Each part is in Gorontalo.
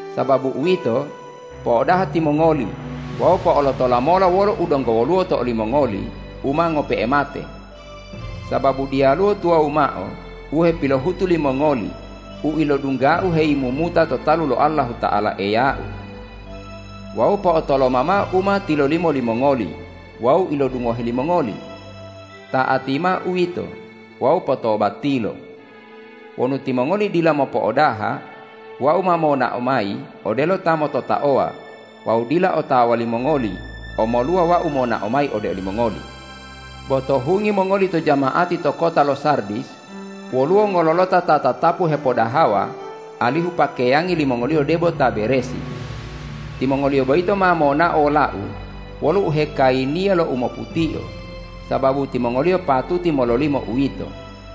Sababu uwito, po'odaha timongoli wawu po'olotola mola wolo u donggo woluwo to olimongoli u ma ngope'e mate. Sababu diyaluwo tuwawu mao u hepilohutu limongoli u ilodungga-U heyimumuta to talu lo Allahuta'ala Eya-U. Wawu po'otoloma mao u ma tilolimo limongoli wawu ilodungohe limongoli. Ta'ati mao uwito wawu potobatilo! Wonu timongoli dila mopo'odaha, Wau ma monao mayi odelo ta mototaowa wawu dila otawa limongoli omoluwa Wau monao mayi ode olimongoli. Bo to hungi mongoli to jama'ati to kota lo Sardis, woluwo ngololota ta tatapu hepodahawa alihu pakeyangi limongoliyo debo ta beresi. Timongoliyo boyito ma monao wola-U wolo uhekayiniya lo umoputio, sababu timongoliyo patuti mololimo uwito.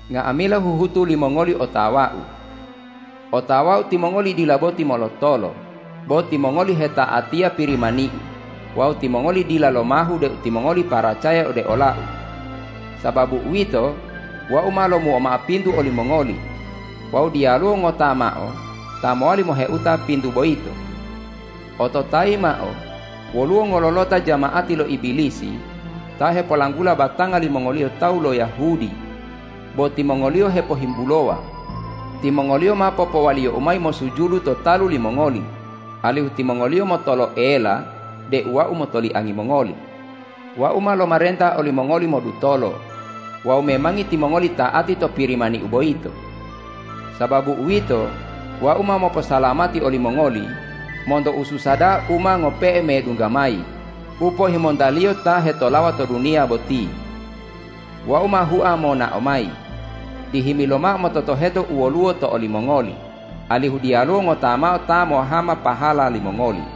Nga'amila huhutu limongoli otawa-U. Otawa-U timongoli dila boti molotolo, bo timongoli heta'atiya Pirimani-U wawu timongoli dila lomahu deu timongoli paracaya ode ola-U. Sababu uwito, Wau ma lomuo mao pintu olimongoli wawu diyaluwo ngota mao ta mowali moheuta pintu boyito. Ototayi mao, woluwo ngololota jama'ati lo Ibilisi ta hepolanggula batanga limongoliyo tawu lo Yahudi, bo timongoliyo hepohimbulowa. Timongoliyo ma popowaliyo-U mayi mosujudu to talu limongoli, alihu timongoliyo motoloela deu Wau motoliangi mongoli. Wau ma lomarenta olimongoli modutolo wawu memangi timongoli ta'ati to Pirimani-U boyito. Sababu uwito, Wau ma moposalamati olimongoli monto ususa da'a u ma ngope'e medungga mayi u pohimontaliyo ta hetolawa to duniya boti. Wau ma hua monao mayi. Dihimi lomao mototoheto u woluwo to olimongoli, alihu diyaluwo ngota mao ta mohama pahala limongoli.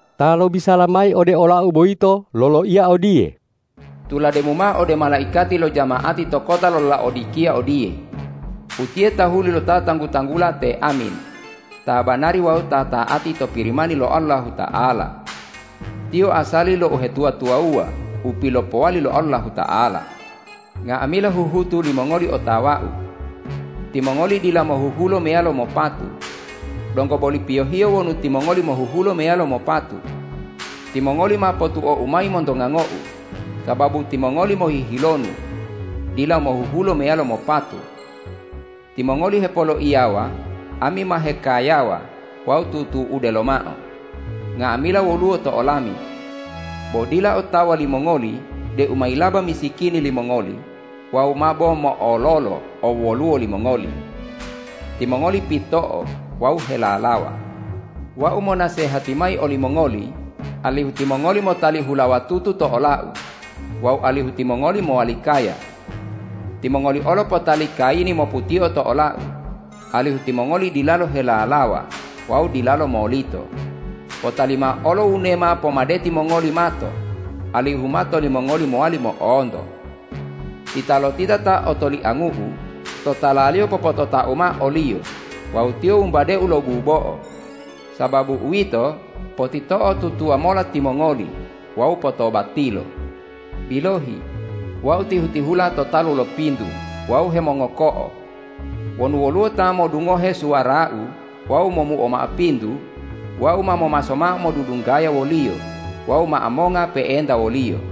Ta lobisala mayi ode olau boyito loloiya odiye: Tulademu mao ode malaikati lo jama'ati to kota lo Laodikiya odiye,”Utiye tahuli lo Ta tanggu-tanggula te Amin, Ta banari wawu Ta ta'ati to Pirimani lo Allahuta'ala. Tiyo asali lo uhetuwa-tuwawuwa u pilopowali lo Allahuta'ala: Nga'amila huhutu limongoli otawa-U. Timongoli dila mohuhulo meyalo mopatu. Donggo boli piyohiyo wonu timongoli mohuhulo meyalo mopatu! Timongoli ma potuo-U mayi monto ngango-U, sababu timongoli mohihilonu dila mohuhulo meyalo mopatu. Timongoli hepoloiyawa, ’Ami ma hekayawa wawu tutu'ude lomao; nga'amila woluwo to olami.’ Bo dila otawa limongoli deu mayilaba misikini limongoli wawu mabo mo'ololo owwoluwo limongoli. Timongoli pito'o wawu helalawa. Wau monasehati mayi olimongoli alihu timongoli motali hulawa tutu to ola-U wawu alihu timongoli mowali kaya. Timongoli olo potali kayini moputio to ola-U, alihu timongoli dilalo helalawa wawu dilalo molito. Potali mao olo wunema pomadeti mongoli mato, alihu mato limongoli mowali mo'onto. Titalotita ta otoliangu-U, totalaliyo popotota-U mao oliyo wawu tiyo wumbade-U lo bubo'o. Sababu uwito, potito'otutuwa mola timongoli wawu potobatilo. Bilohi, Wau tihu-tihula to talu lo pintu wawu hemongoko'o. Wonu woluwo ta modungohe suwara-U wawu momuo mao pintu, Wau ma momaso mao modudunggaya woliyo wawu mao monga pe'enta woliyo.